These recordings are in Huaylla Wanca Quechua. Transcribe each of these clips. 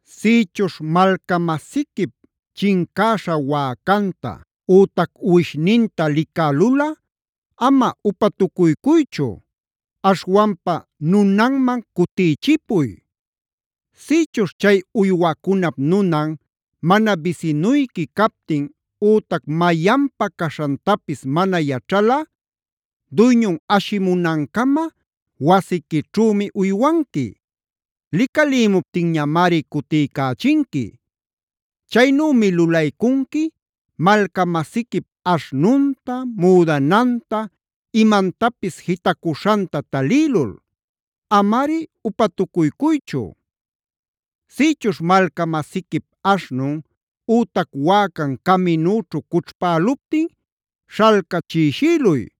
“Sïchuśh malca-masiquip chincäśha wäcanta ütac uwishninta licälulꞌa ama upatucuycuychu. Aśhwanpa nunanman cutïchipuy. Sïchuśh chay uywacunap nunan mana bisinuyqui captin ütac mayanpa caśhantapis mana yaćhalꞌa, duyñun ashimunancama wasiquićhümi uywanqui. Licalïmuptinñamari cutiycächinqui. Chaynümi lulaycunqui malca-masiquip aśhnunta, müdananta, imantapis jitacüśhanta talïlul. Amari upatucuycuychu. “Sïchuśh malca-masiquip aśhnun ütac wäcan caminüćhu cućhpäluptin śhalcachïshïluy.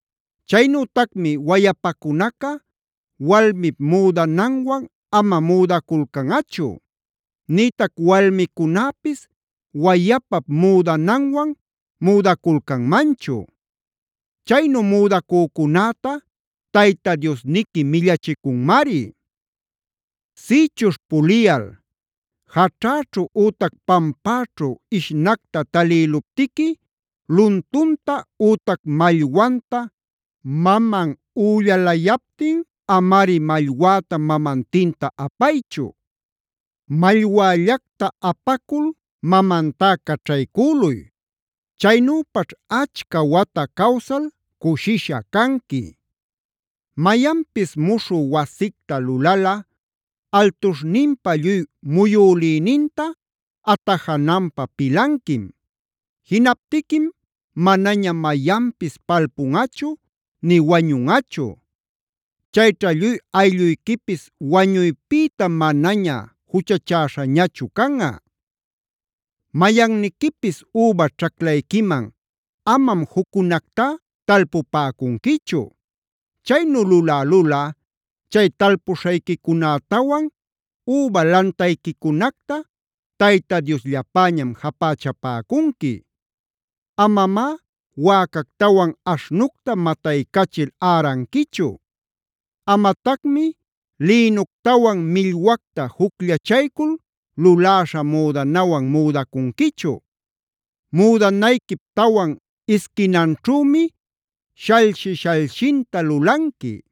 “Chaynütacmi wayapacunaca walmip müdananwan ama müdaculcanꞌachu; nïtac walmicunäpis wayapap müdananwan müdaculcanmanchu. Chaynu müdacücunäta Tayta Diosniqui millachicunmari. “Sïchuśh puliyal jaćhäćhu ütac pampäćhu ishnacta talïluptiqui, luntunta ütac mallwanta maman üllalayaptin amari mallwäta mamantinta apaychu. Mallwällacta apacul mamantá caćhaycüluy. Chaynüpaćh achca wata cawsal cushisha canqui. “Mayanpis muśhü wasicta lulalꞌa altuśhninpa lluy muyülïninta atajananpä pilanquim. Jinaptiquim manaña mayanpis palpunꞌachu, ni wañunꞌachu. Chayćha lluy aylluyquipis wañuypïta manaña juchachäśhañachu canꞌa. “Mayanniquipis üba ćhaclayquiman amam juccunactá talpupäcunquichu. Chaynu lulälulꞌa, chay talpuśhayquicunätawan üba lantayquicunacta Tayta Diosllapäñam japächapäcunqui. “Amamá wäcactawan aśhnucta mataycachil äranquichu. “Amatacmi lïnuctawan millwacta jucllachaycul luläśha müdanawan müdacunquichu.b “Müdanayquip tawan isquinanćhümi shallshi-sallshinta lulanqui.c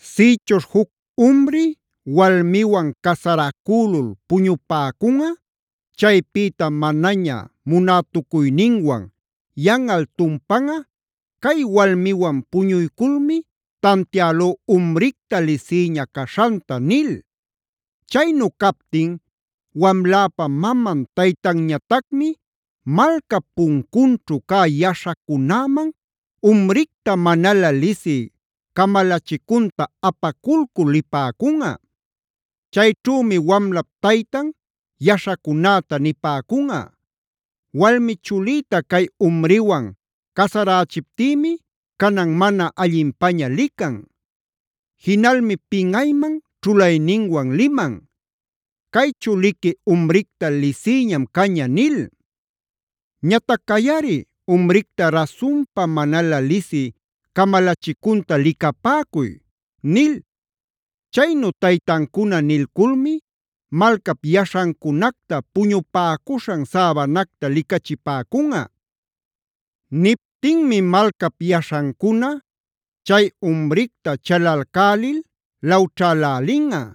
“Sïchuśh juc umri walmiwan casaracülul puñupäcunꞌa; chaypïta manaña munätucuyninwan, yanꞌal tumpanꞌa: ‘Cay walmiwan puñuyculmi tantialú umricta lisïña caśhanta’ nil. Chaynu captin wamläpa maman taytanñatacmi malcap puncunćhu cä yaśhacunäman umricta manalä lisï camalachicunta apaculcul lipäcunꞌa. Chayćhümi wamlap taytan yaśhacunäta nipäcunꞌa: ‘Walmi chulïta cay umriwan casarächiptïmi canan mana allinpaña lican. Jinalmi pinꞌayman ćhulayninwan liman: “Cay chuliqui umricta lisïñam caña” nil. Ñatac cayꞌari umricta rasunpa manalä lisï camalachicunta licapäcuy’ nil. Chaynu taytancuna nilculmi malcap yaśhancunacta puñupäcuśhan säbanacta licachipäcunꞌa. Niptinmi malcap yaśhancuna chay umricta chalalcälil lawćhälälinꞌa.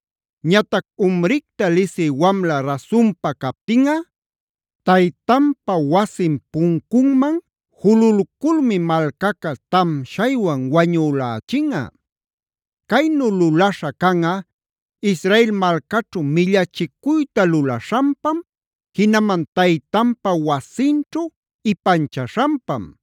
“Ñatac umricta lisï wamla rasunpa captinꞌa, taytanpa wasin puncunman jululculmi malcaca tamshaywan wañülächinꞌa. Caynu lulaśha canꞌa Israel malcaćhu millachicuyta lulaśhanpam, jinaman taytanpa wasinćhu ipanchaśhanpam.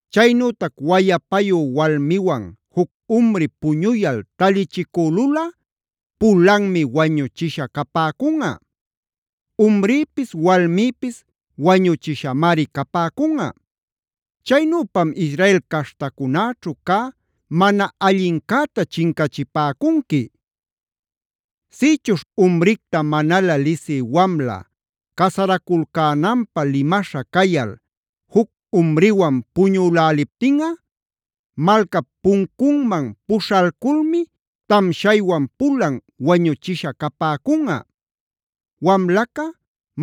“Chaynütac wayapayu walmiwan juc umri puñuyal talichicülulꞌa pulanmi wañuchisha capäcunꞌa. Umrïpis walmïpis wañuchishamari capäcunꞌa. Chaynüpam Israel caśhtacunäćhu cä mana allincäta chincachipäcunqui. “Sïchuśh umricta manalä lisï wamla casaraculcänanpä limaśha cayal, juc umriwan puñüläliptinꞌa, malcap puncunmnan puśhalculmi tamshaywan pulan wañuchisha capäcunꞌa;e wamlaca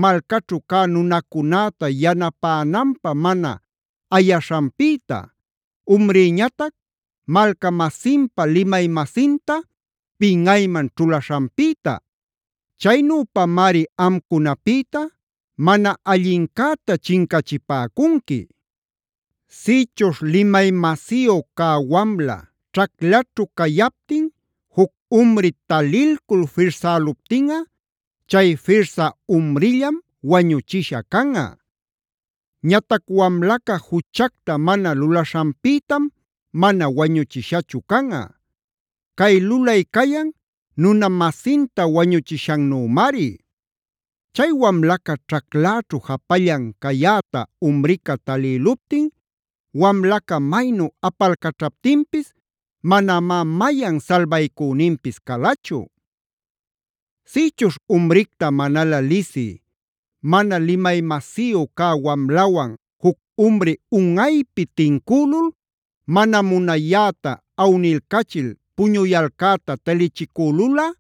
malcaćhu cä nunacunäta yanapänanpä mana ayaśhanpïta; umrïñatac malca-masinpa limay-masinta pinꞌayman ćhulaśhanpïta. Chaynüpamari amcunapïta mana allincäta chincachipäcunqui. “Sïchuśh limay-masiyu cä wamla ćhaclaćhu cayaptin juc umri talilcul firsäluptinꞌa, chay firsä umrillam wañuchisha canꞌa. Ñatac wamlaca juchacta mana lulaśhanpïtam mana wañuchishachu canꞌa. Cay lulay cayan nuna-masinta wañuchishannümari. Chay wamlaca ćhacläćhu japallan cayäta umrica talïluptin wamlaca maynu apalcaćhaptinpis manamá mayan salbaycüninpis calachu. “Sïchuśh umricta manalä lisï, mana limay-masiyu cä wamlawan juc umri unꞌaypi tincülul mana munayäta awnilcachil puñuyalcäta talichicülulꞌa,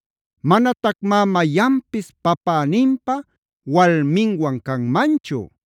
“Manatacmá mayanpis papäninpa walminwan canmanchu.